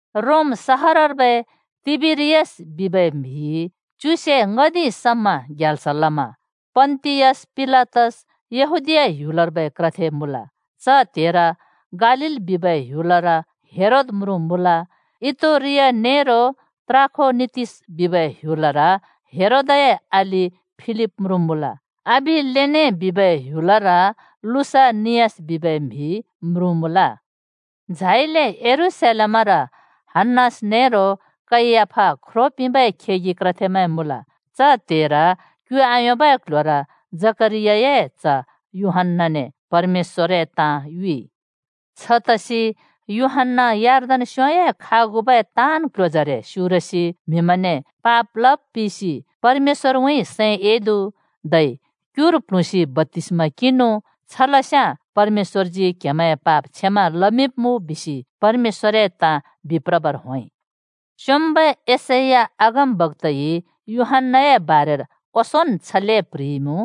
रोम सहरर्बै तिबेरियस बिबै म्‍हिइ च्युसे ङ्‍हदिं समा ग्याल्स लमा पन्‍तियस पिलातस यहूदीया ह्‍युलर्बै क्रथे मुँल। च त्हेर गालील बिबै ह्‍युलर हेरोद म्रुँ मुँल। इतुरिया नेरो त्राखोनितिस बिबै ह्‍युलर हेरोदए अलि फिलिप म्रुँ मुँल। अबिलेने बिबै ह्‍युलर लुसानियास बिबै म्हि म्रुँ मुँल। झाइले यरूशलेमर हन्‍नास नेरो कैयाफा ख्रो पिंबै खेगि क्रथेमैं मुँल। च त्‍हेर क्यु आयोंबै क्ल्ह्‍योर जकरियाए च्‍ह यूहन्‍नाने परमेश्‍वरए ताँ युइ। छतसि यूहन्‍ना यर्दन स्‍योंए खागुबै ताँन् क्‍ल्‍ह्‍योजरे स्‍युरसि म्हिमैंने पाप लब पिसि परमेश्‍वरउँइँ सैं एदु धै क्‍युर प्‍ल्हुँसि बप्‍तिस्‍मा किंनु। छलस्याँ परमेश्‍वरजी क्‍हेमैंए पाप क्षमा लमिंब्‍मुँ बिसि परमेश्‍वरए ताँ बिप्रबर होंइ। स्योंम्बै यशैया अगमबक्‍ताइ यूहन्‍नाए बारेर ओंसोंन् छले प्‍ह्रिइमुँ,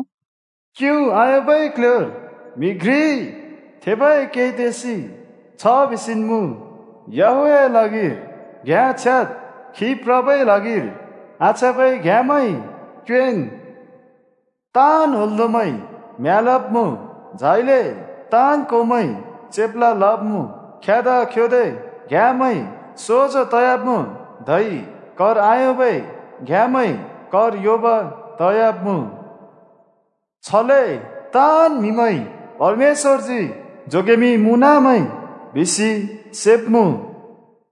“क्यु आयोंबै क्ल्ह्‍योर म्‍हि घ्रिइ कै तेसि छ बिसिन् मुँ, ‘याहवेहए ल्हागिर घ्‍याँ छ्याद्! खी प्रबै ल्हागिर आछ्याँबै घ्‍याँमैं क्योंएँन्! ताँन् होंल्‍दोंमैं म्यालब्मुँ झाइले ताँन् कोंमैं चेप्ला लब्मुँ, ख्यदा-ख्योदे घ्‍याँमैं सोजो तयाब्मुँ, धै कर आयोंबै घ्‍याँमैं कर योंब तयाब्मुँ। छले ताँन् म्हिमैंइ परमेश्‍वरजी जोगेमिंमुँनामैं बिसि सेब्‍मुँ।’”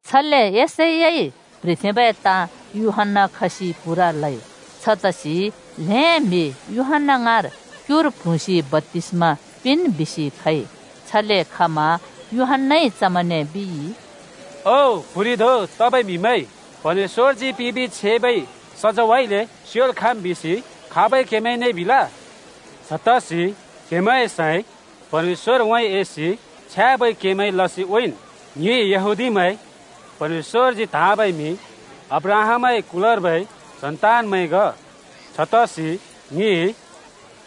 छले यशैयाइ प्‍ह्रिथेंबै ताँ यूहन्‍ना खसि पूरा लइ। छतसि ल्हें म्हि यूहन्‍ना ङाँर क्युर प्ल्हुँसि बप्‍तिस्मा पिंन् बिसि खइ। छले खमा यूहन्‍नाइ चमैंने बिइ, “ओ, प्‍हुरि धों तबै म्‍हिमैं! परमेश्‍वरजी पिंबि छेबै सजैंउँइँले स्योल् खाँम् बिसि खाबइ क्‍हेमैंने बिल? छतसि क्हेंमैए सैं परमेश्‍वरउँइँ एसि छ्याँबै के लसि उँइँन्। ‘ङि यहूदीमैं परमेश्‍वरजी त्‍हाँबै म्‍हि अब्राहामए कुलर्बै सन्तानमैं ग। छतसि ङिइ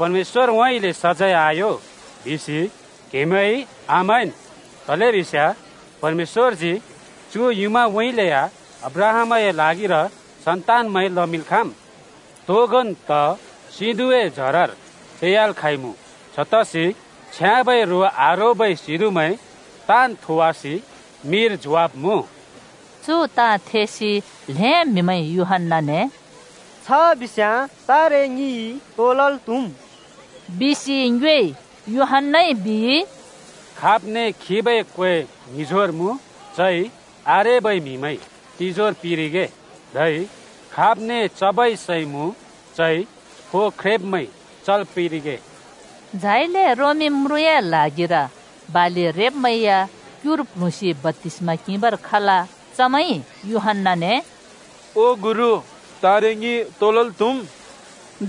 परमेश्‍वरउँइँले सजैं आयों बिसि क्हेमैंइ आमैंन्’ तलेबिस्याँ परमेश्‍वरजी चु युँमाउँइँले या अब्राहामए ल्हागिर सन्तानमैं लमिंल् खाँम्। तोगोन् त सिंधुँए जरर फेयाल् खाँइँमुँ छतसि छ्याँबै रो आरोबै सिंधुँमैं ताँन् थोवासि मिर झोंवाब्‍मुँ।” चु ताँ थेसि ल्‍हें म्‍हिमैंइ यूहन्‍नाने “छ बिस्याँ तारे ङिइ तो लल् त्हुम्?” बिसि ङ्योएइ। यूहन्‍नाइ बिइ, “खाब्ने खिबै क्वें ङ्हिजोर मुँ, चइ आरेबै म्हिमैं तिजोर पिंरिगे, धै खाब्ने चबै सै मुँ चइ फो ख्रेंब्मैं चल् पिंरिगे।” झाइले रोमी म्रुँए ल्हागिर बालि रेब्‍मैं या क्युर प्ल्हुँसि बप्‍तिस्मा किंबर खल। चमैंइ यूहन्‍नाने “ओ गुरु, तारे ङिइ तो लल् त्हुम्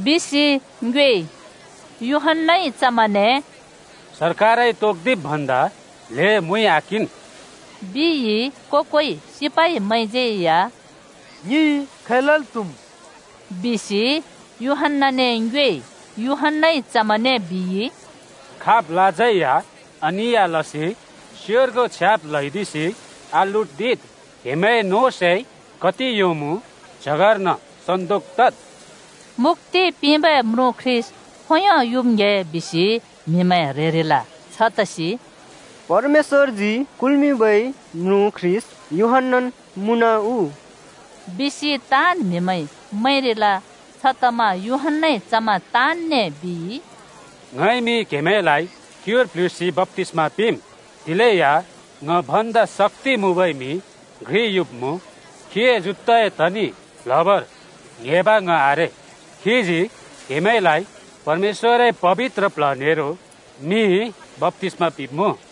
बिसि ङ्योइ?” यूहन्‍नाइ चमैंने “सरकारइ तोक्दिब् भन्दा ल्हें मुइ आकिंन्,” बिइ। को-कोइ सिपाइमैंज्यै या “ङिइ खै लल् त्‍हुम्?” बिसि यूहन्‍नाने ङ्योएइ। यूहन्‍नाइ चमैंने बिइ, “खाब‍लाज्‍यै या अनिया लसि स्योर्गों छ्याब् ल्हैदिसि आलुट्दिद्। क्‍हेमैंए नों सै कति योंमुँ च्‍हगर्न सन्‍दोक तद्।” मुक्‍ति पिंबै म्रुँ ख्रीष्‍ट खोंयों युम् ङ्‍हे बिसि म्हिमैं ह्रेरिल। छतसि “परमेश्‍वरजी कुल्‍मिंबै म्रुँ ख्रीष्‍ट यूहन्‍नान् मुँन उ?” बिसि ताँन् म्हिमैंइ मैंरिल। छतमा यूहन्‍नाइ चमैं ताँनने बिइ, “ङइमि क्‍हेमैंलाइ क्युर प्ल्हुँसि बप्‍तिस्मा पिंम्। दिलेया ङ भन्दा शक्‍ति मुँबै म्‍हि घ्रि युब्‍मुँ। खीए जुत्ताए तनि प्‍ल्हबर ङ्‍हेंब ङ आरे। खीजी क्‍हेमैंलाइ परमेश्‍वरए पबित्र प्ल्ह नेरो मिइ बप्‍तिस्मा पिंब्मुँ।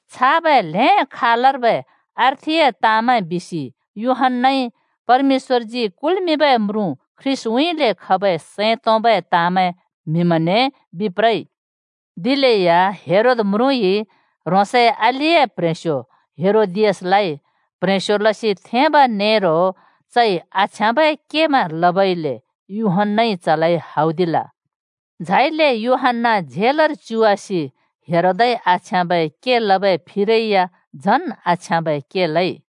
छाबै ल्‍हें खालर्बै अर्थिए ताँमैं बिसि यूहन्‍नाइ परमेश्‍वरजी कुल्‍मिंबै म्रुँ ख्रीष्‍टउँइँले खबै सैं तोंबै ताँमैं म्हिमैंने बिप्रइ। दिलेया हेरोद म्रुँइ ह्रोंसए अलिए प्ह्रेंस्यो हेरोदियासलाइ प्ह्रेंस्यो लसि थेंब नेरो चइ आछ्याँबै केमैं लबइले यूहन्‍नाइ चलाइ हौदिल। झाइले यूहन्‍ना झेलर च्युवासि हेरोदइ आछ्याँबै के लबै फिरै या झन् आछ्याँबै के लइ।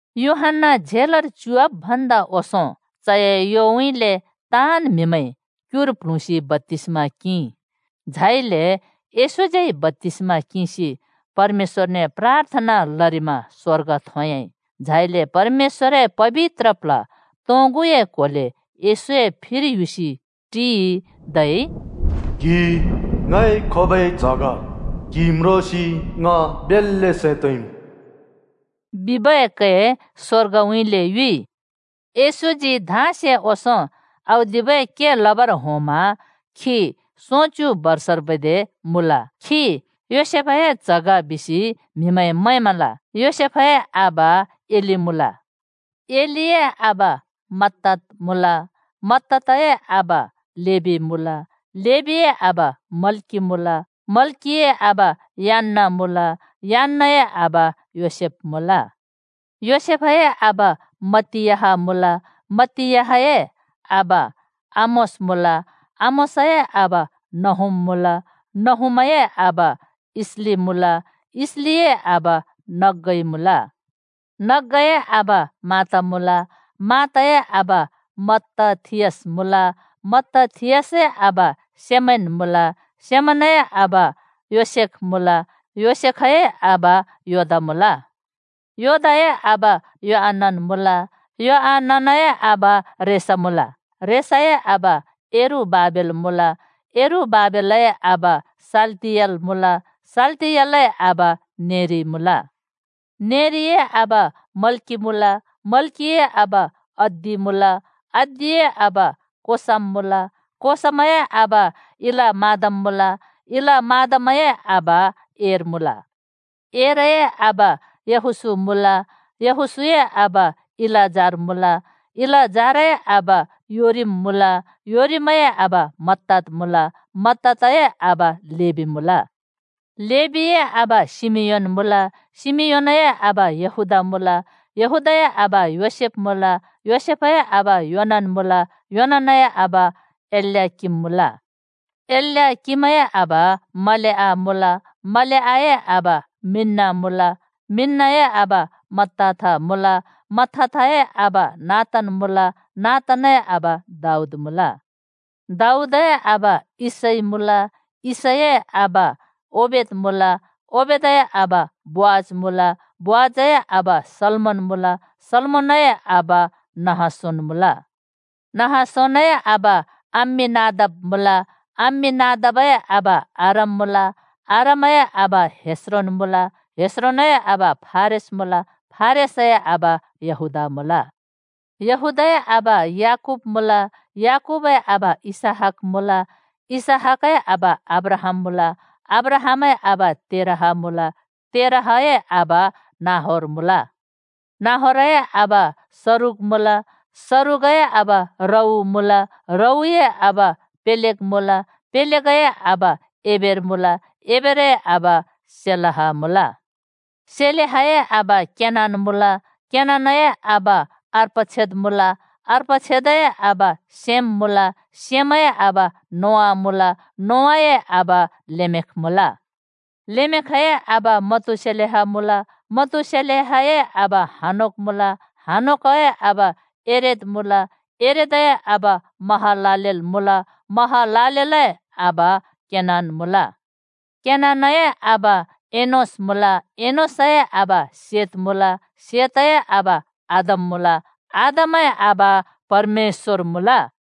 यूहन्‍ना झेलर च्‍युवाब् भन्दा ओंसों चए योउँइँले ताँन् म्हिमैंइ क्‍युर प्‍ल्हुँसि बप्‍तिस्मा किंइ। झाइले येशूज्यै बप्‍तिस्मा किंसि परमेश्‍वरने प्राथना लरिमा स्‍वर्ग थोंयाँइ। झाइले परमेश्‍वरए पबित्र प्ल्ह तोंगुए क्‍होले येशूए फिर युसि टिइ। धै “क्‍हि ङए खोबै च्‍ह ग, क्‍हि म्रोंसि ङ बेल्‍ले सैं तोंइमुँ,” बिबै कै स्‍वर्गउँइँले युइ। येशूजी धाँसे ओंसों औदिबै के लबर होंमा खी सोंच्‍यु बर्षर्बै दे मुँल। खी योसेफए च्ह ग बिसि म्हिमैंइ मैंमल। योसेफए आबा एली मुँल। एलीए आबा मत्तात मुँल। मत्तातए आबा लेबी मुँल। लेबीए आबा मल्की मुँल। मल्‍किए आबा यान्‍ना मुँल। यान्‍नाए आबा योसेफ मुँल। योसेफए आबा मत्तियाह मुँल। मत्तियाहए आबा आमोस मुँल। आमोसए आबा नहूम मुँल। नहूमए आबा इसली मुँल। इसलिए आबा नग्‍गै मुँल। नग्‍गैए आबा मात मुँल। मातए आबा मत्तथियास मुँल। मत्तथियासए आबा सेमैन मुँल। सेमैनए आबा योसेख मुँल। योसेखए आबा योदा मुँल। योदाए आबा योआनन मुँल। योआननए आबा रेशा मुँल। रेसाए आबा यरुबाबेल मुँल। यरुबाबेलए आबा शालतिएल मुँल। शालतिएलए आबा नेरि मुँल। नेरिए आबा मल्की मुँल। मल्कीए आबा अद्दी मुँल। अद्दीए आबा कोसाम मुँल। कोसामए आबा इलमादाम मुँल। इलमादामए आबा एर मुँल। एरए आबा यहोशू मुँल। यहोशूए आबा इलाजार मुँल। इलाजारए आबा योरीम मुँल। योरीमए आबा मत्तात मुँल। मत्तातए आबा लेबी मुँल। लेबीए आबा शिमियोन मुँल। शिमियोनए आबा यहूदा मुँल। यहूदाए आबा योसेफ मुँल। योसेफए आबा योनान मुँल। योनानए आबा एल्याकिम मुँल। एल्याकिमए आबा मलेआ मुँल। मलेआए आबा मिन्‍ना मुँल। मिन्‍नाए आबा मत्ताथा मुँल। मत्ताथाए आबा नातान् मुँल। नातानए आबा दाऊद मुँल। दाऊदए आबा यिशै मुँल। यिशैए आबा ओबेद मुँल। ओबेदए आबा बोअज मुँल। बोअजए आबा सल्‍मोन मुँल। सल्‍मोनए आबा नहशोन मुँल। नहशोनए आबा अम्‍मीनादाब मुँल। अम्‍मीनादाबए आबा आराम मुँल। आरामए आबा हेस्रोन मुँल। हेस्रोनए आबा फारेस मुँल। फारेसए आबा यहूदा मुँल। यहूदाए आबा याकूब मुँल। याकूबए आबा इसहाक मुँल। इसहाकए आबा अब्राहाम मुँल। अब्राहामए आबा तेरह मुँल। तेरहए आबा नाहोर मुँल। नाहोरए आबा सरूग मुँल। सरूगए आबा रऊ मुँल। रऊए आबा पेलेग मुँल। पेलेगए आबा एबेर मुँल। एबेरए आबा शेलह मुँल। शेलहए आबा केनान मुँल। केनानए आबा अर्पक्षद मुँल। अर्पक्षदए आबा शेम मुँल। शेमए आबा नोआ मुँल। नोआए आबा लेमेख मुँल। लेमेखए आबा मतूशेलह मुँल। मतूशेलहए आबा हनोक मुँल। हनोकए आबा येरेद मुँल। येरेदए आबा महलालेल मुँल। महलालेलए आबा केनान मुँल। केनानए आबा एनोश मुँल। एनोशए आबा शेत मुँल। शेतए आबा आदम मुँल। आदमए आबा परमेश्‍वर मुँल।